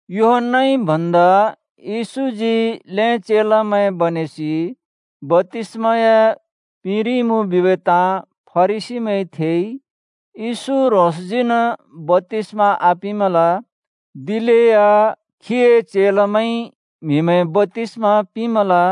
यूहन्‍नाइ भन्दा येशूजी ल्हें चेलामैं बनेसि बप्‍तिस्‍म या पिंरिइमुँ बिबै ताँ फरिसीमैंइ थेइ। (येशू ह्रोंसजीन् बप्‍तिस्मा आपिंमल। दिलेया खीए चेलामैंइ म्हिमैं बप्‍तिस्मा पिंमल।)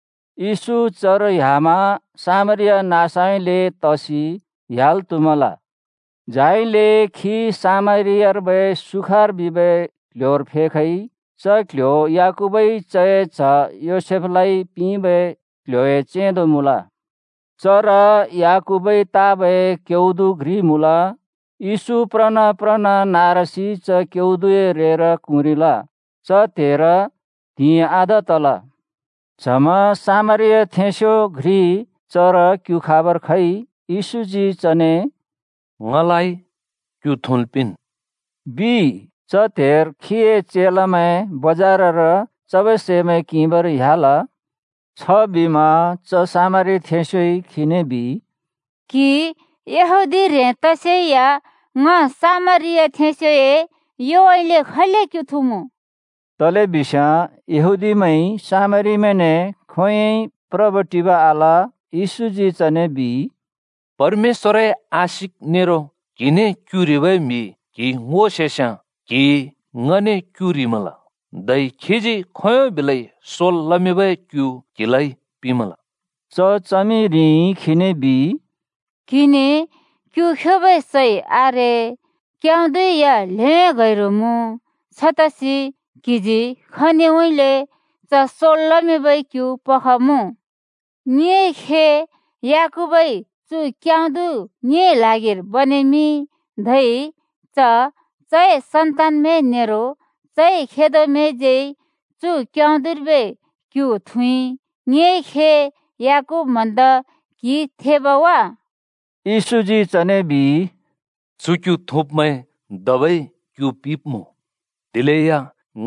येशू चर ह्‍यामा सामरिया नाँसउँइँले तसि ह्‍याल् त्‍हुमल। झाइले खी सामरियार्बै सुखार बिबै क्ल्ह्‍योर फेखइ। च क्‍ल्‍ह्‍यो याकूबइ चए च्ह योसेफलाइ पिंबै क्ल्ह्‍‍योए चेंदो मुँल। चर याकूबइ ताबै क्‍यउदु घ्रि मुँल। येशू प्रना प्रन् नारासि च क्यउदुए रेर क्हुँरिल। च त्हेर त्हिंइ आधा तल। च्हमा सामरियाथेंस्यो घ्रि चर क्यु खाबर खइ। येशूजी चने “ङलाइ क्यु थुँल् पिंन्,” बिइ। च त्हेर खीए चेलामैं बजारर चबै सैमैं किंबर ह्‍याल। छबिमा च सामरियाथेंस्योइ खीने बिइ, “क्‍हि, यहूदी ह्रें तसेया ङ सामरियाथेंस्योए योउँइँले खैले क्यु थुँमुँ?” (तलेबिस्याँ यहूदीमैंइ सामरीमैंने खोंयोंइ प्रब्-टिब आल।) येशूजी चने बिइ, “परमेश्‍वरए आशिक नेरो क्हिने क्यु ह्रिबै म्हि क्हिइ ङो सेस्याँ क्हिइ ङने क्यु ह्रिमल, धै खीजी खोंयों बिलै सोल् लमिंबै क्यु क्हिलाइ पिंमल।” च च्हमिरिइ खीने बिइ, “क्हिने क्यु ख्योबै सै आरे, क्यउदु या ल्हें गैरु मुँ। छतसि क्हिजी खनिउँइँले च सोल् लमिंबै क्यु पखमुँ? ङिए खे याकूबइ चु क्यउदु ङिए ल्हागिर बनेमिंइ, धै च, चए सन्तानमैं नेरो चए खेदोमैंज्यै चु क्यउदुर्बै क्यु थुँइ। ङिए खे याकूब भन्दा क्हि थेब वा?” येशूजी चने बिइ, “चु क्‍यु थुँब्‍मैं धबै क्‍यु पिब्मुँ, दिलेया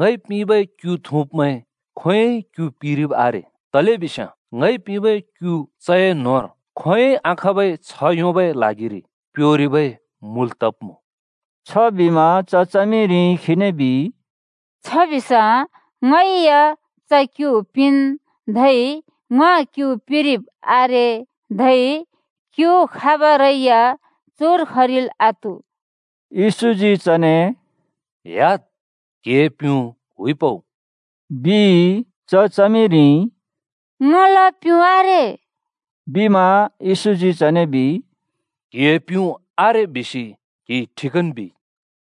ङइ पिंबै क्‍यु थुँब्मैं खोंयोंइ क्‍यु पिरिब् आरे। तलेबिस्याँ ङइ पिंबै क्‍यु चए न्‍होंर खोंयोंइ आखाँबै छ्ह योंबै ल्हागिरि प्योरिबै मुल तब्मुँ।” छबिमा च च्हमिरिइ खीने बिइ, “छबिस्याँ ङै या च क्यु पिंन्, धै ङ क्यु पिरिब् आरे, धै क्यु खाबरै या चुर खरिल् आत्हु।” येशूजी चने “ह्‍याद्! क्‍हिए प्‍युँ हुइ पउ,” बिइ। च च्हमिरिइ “ङला प्‍युँ आरे,” बिमा। येशूजी चने बिइ, “क्हिए ‘प्‍युँ आरे’ बिसि क्हिइ ठिकन् बिइ।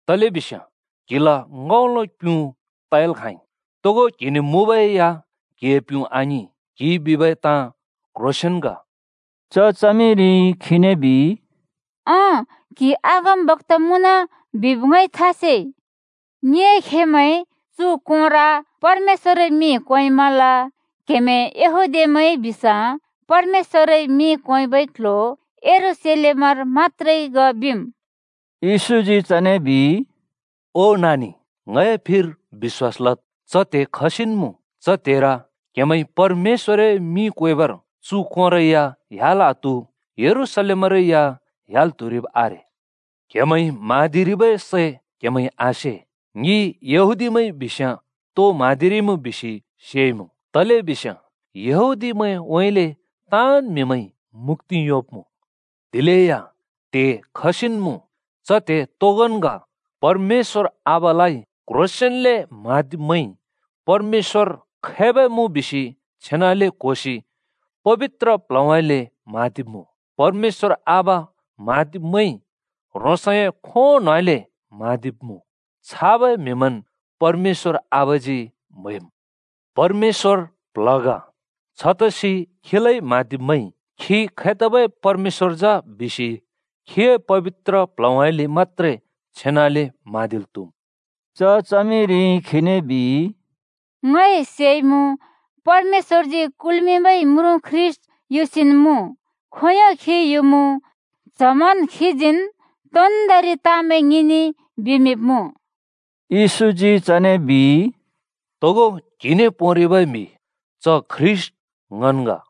तलेबिस्याँ क्‍हिला ङ्‍हउँलो प्युँ तयाल् खाँइ, तोगो क्‍हिने मुँबै या क्हिए प्युँ आङिं। क्‍हिइ बिबै ताँ क्‍ह्रोंसेंन् ग।” च च्हमिरिइ खीने बिइ, “अँ, क्‍हि अगमबक्‍ता मुँन बिब ङइ था सेइ। ङिए खेमैंइ चु कोंर परमेश्‍वरए मिं क्वेमल, क्‍हेमैं यहूदीमैं बिस्याँ परमेश्‍वरए मिं क्वेबै क्‍ल्‍ह्‍यो यरूशलेमर मत्‍त्रे ग बिम्।” येशूजी चने बिइ, “ओ नानि, ङए फिर बिश्‍वास लद्, च त्हे खसिन् मुँ, च त्हेर क्हेमैंइ परमेश्‍वरए मिं क्‍वेबर चु कोंरै ह्‍याल् आत्हु, यरूशलेमरै या ह्‍याल् त्हुरिब् आरे। क्हेमैंइ म्हाँदिरिबै सै क्‍हेमैंइ आसे। ङि यहूदीमैंइ बिस्‍याँ तो म्हाँदिरिइमुँ बिसि सेइमुँ। तलेबिस्याँ यहूदीमैंउँइँले ताँन् म्‍हिमैंइ मुक्‍ति योंब्मुँ। दिलेया त्हे खसिन् मुँ, च त्हे तोगोंन् ग, परमेश्‍वर आबालाइ क्‍ह्रोंसेंन्ले म्हाँदिब्मैंइ परमेश्‍वर खैबै मुँ बिसि छेनाले क्होसि पबित्र प्ल्हउँइँले म्हाँदिब्मुँ। परमेश्‍वर आबा म्हाँदिब्मैंइ ह्रोंसए खों न्होउँइँले म्हाँदिब्मुँ। छाबै म्हिमैंन् परमेश्‍वर आबाजी म्‍हैम्। परमेश्‍वर प्ल्ह ग। छतसि खीलाइ म्हाँदिब्मैंइ खी खैतबै परमेश्‍वर जा बिसि खीए पबित्र प्ल्हउँइँले मत्‍त्रे छेनाले म्हाँदिल् त्‍हुम्।” च च्हमिरिइ खीने बिइ, “ङइ सेइमुँ परमेश्‍वरजी कुल्मिंबै म्रुँ ख्रीष्‍ट युसिन् मुँ, खोंयों खी युमुँ, च्हमन् खीजीन् तोन्दोंरि ताँमैं ङिने बिमिंब्मुँ।” येशूजी चने बिइ, “तोगो क्‍हिने पोंरिबै म्हि, च ख्रीष्‍ट ङन् ग।”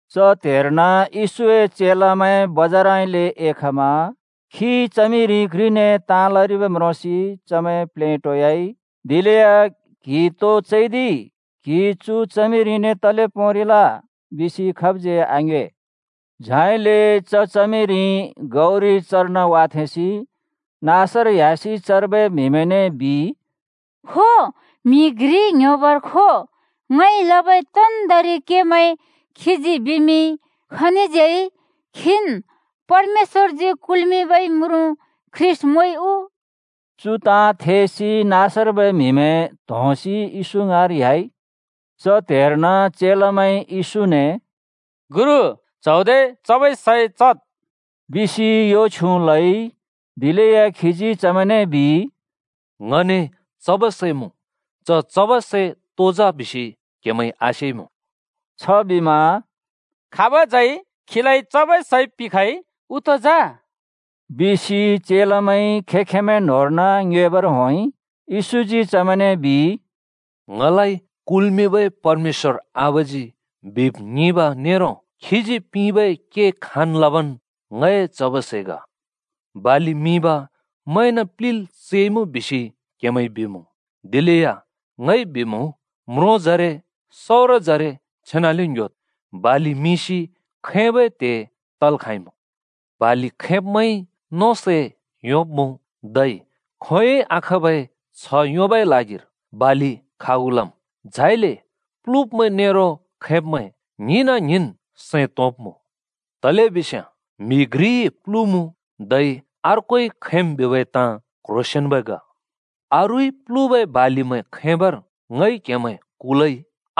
च त्‍हेर्न येशूए चेलामैं बजारउँइँले एखमा। खी च्हमिरि घ्रिने ताँ लरिब् म्रोंसि चमैं प्लेटोयाइ। दिलेया “क्हि तो चैदिइ?” “क्‍हि चु च्हमिरिने तले पोंरिल?” बिसि खाबज्यै आङ्योए। झाइले च च्हमिरि गौरि चर्न वाथेंसि नाँसर ह्‍यासि चर्बै म्‍हिमैंने बिइ, “खो, म्हि घ्रि ङ्‍ह्‍योबर खो! ङइ लबै तोन्दोंरि केमैं खीजी बिमिंइ। खनिज्यै खीन् परमेश्‍वरजी कुल्मिंबै म्रुँ ख्रीष्‍ट मुँइ उ?” चु ताँ थेसि नाँसर्बै म्‍हिमैं त्होंसि येशू ङाँर ह्‍याइ। च त्हेर्न चेलामैंइ येशूने “गुरु, च्हौदे चबै सै चद्,” बिसि यो छ्युँ लइ। दिलेया खीजी चमैंने बिइ, “ङने चबै सै मुँ। च चबै सै तो जा बिसि क्हेमैंइ आसेइमुँ।” छबिमा “खाबज्यै खीलाइ चबै सै पिंखइ उ तो जा?” बिसि चेलामैंइ खें-खेंमैं न्‍होंर्न ङ्योएबर होंइ। येशूजी चमैंने बिइ, “ङलाइ कुल्मिंबै परमेश्‍वर आबाजी बिब् ङिंब नेरो खीजी पिंबै के खाँन् लबन् ङए चबै सै ग। ‘बालि मिंब म्हैंन प्लिल् चैइमुँ,’ बिसि क्हेमैंइ बिमुँ, दिलेया ङइ बिमुँ, म्रोंजरे, सउरजरे छेनाले ङ्‍ह्‍योद्! बालि मिंसि खैंबै त्हे तल् खाँइमुँ। बालि खैंब्मैंइ नों सै योंब्‍मुँ, धै खोंयोंइ आखाँबै छ्ह योंबै ल्हागिर बालि खागु लम्, झाइले प्लुब्मैं नेरो खैंब्मैं ङ्हिंना ङ्हिंन् सैं तोंब्मुँ। तलेबिस्याँ ‘म्हि घ्रिइ प्लुमुँ, धै अर्कोइ खैंम्,’ बिबै ताँ क्ह्रोसेंन्बै ग। अरूइ प्लुबै बालिमैं खैंबर ङइ क्हेमैं कुलइ।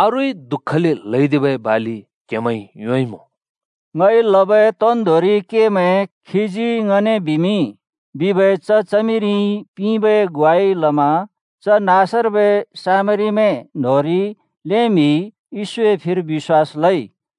अरूइ दुःखले ल्हैदिबै बालि क्हेमैंइ योंइँमुँ।” “ङइ लबै तोन्दोंरि केमैं खीजी ङने बिमिंइ” बिबै च च्हमिरिइ पिंबै ग्वाइ लमा च नाँसर्बै सामरीमैं न्होंरि ल्हें म्हिइ येशूए फिर बिश्‍वास लइ।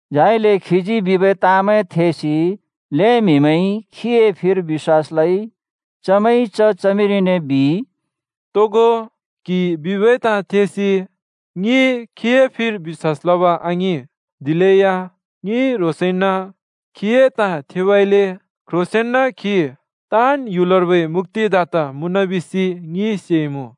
झाइले खीजी बिबै ताँमैं थेसि ल्‍हें म्हिमैंइ खीए फिर बिश्‍वास लइ। चमैंइ च च्हमिरिने बिइ, “तोगो क्‍हिइ बिबै ताँ थेसि ङिइ खीए फिर बिश्‍वास लब आङिं, दिलेया ङिइ ह्रोंसइन खीए ताँ थेबइले क्ह्रोंसेंन खी ताँन् ह्‍युलर्बै मुक्‍तिदाता मुँन बिसि ङिइ सेइमुँ।”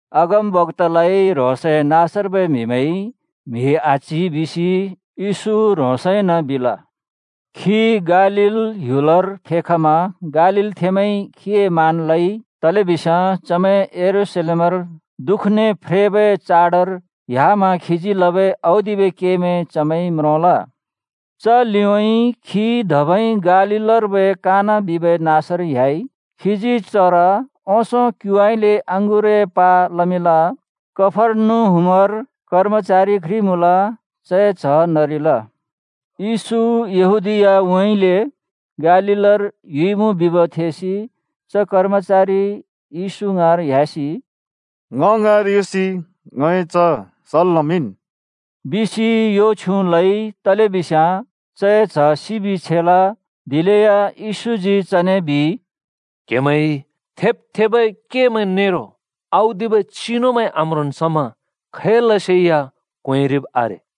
अगमबक्‍तालाइ ह्रोंसए नाँसर्बै म्‍हिमैंइ म्हि आच्‍हि बिसि येशू ह्रोंसइन बिल। खी गालील ह्‍युलर फेखमा गालीलथेंमैंइ खीए मान लइ, तलेबिस्याँ चमैं यरूशलेमर दुःखने फ्रेबै चाडर ह्‍यामा खीजी लबै औदिबै केमैं चमैंइ म्रोंल। च लिउँइँ खी धबै गालीलर्बै काना बिबै नाँसर ह्‍याइ। खीजी चर ओंसों क्युउँइँले अँगुरए प्हा लमिंल। कफर्नहुमर कर्मचारि घ्रि मुँल, चए च्ह नरिल। येशू यहूदीयाउँइँले गालीलर युइमुँ बिब् थेसि च कर्मचारि येशू ङाँर ह्‍यासि “ङ ङाँर युसि ङए च्ह सल् लमिंन्।” बिसि यो छ्युँ लइ, तलेबिस्याँ चए च्ह सिबि छेल। दिलेया येशूजी चने बिइ, “क्हेमैंइ थेब् थेबै केमैं नेरो औदिबै चिनुमैं आम्रोंन् समा खैलसे या क्वेंरिब् आरे।”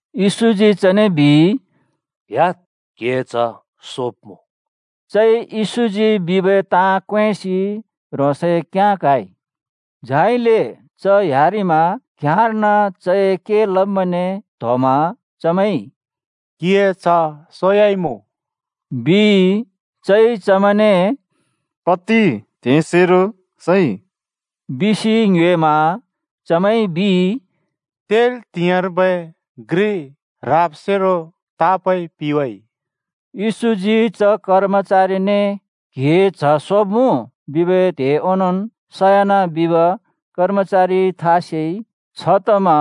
येशूजी चने बिइ, “ह्‍याद्, क्‍हिए च्‍ह सोब्‍मुँ।” चइ येशूजी बिबै ताँ क्वेंसि ह्रोंसए घ्याँ क्हाइ। झाइले च ह्‍यारिमा घ्याँर्न चए के लब्मैंने त्होमा चमैंइ “क्हिए च्ह सोयाइमुँ,” बिइ। चइ चमैंने “कति त्‍हेसेरो सइ?” बिसि ङ्योएमा चमैंइ बिइ, “तेल् त्हिंयाँर्बै घ्रि ह्राबसेरो तापइ पिवाइ।” येशूजी च कर्मचारिने “क्‍हिए च्‍ह सोब्‍मुँ,” बिबै त्हे ओंनोंन् सयान बिब कर्मचारिइ था सेइ। छतमा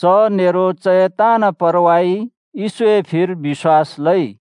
च नेरो चए ताँन् परवाइ येशूए फिर बिश्‍वास लइ।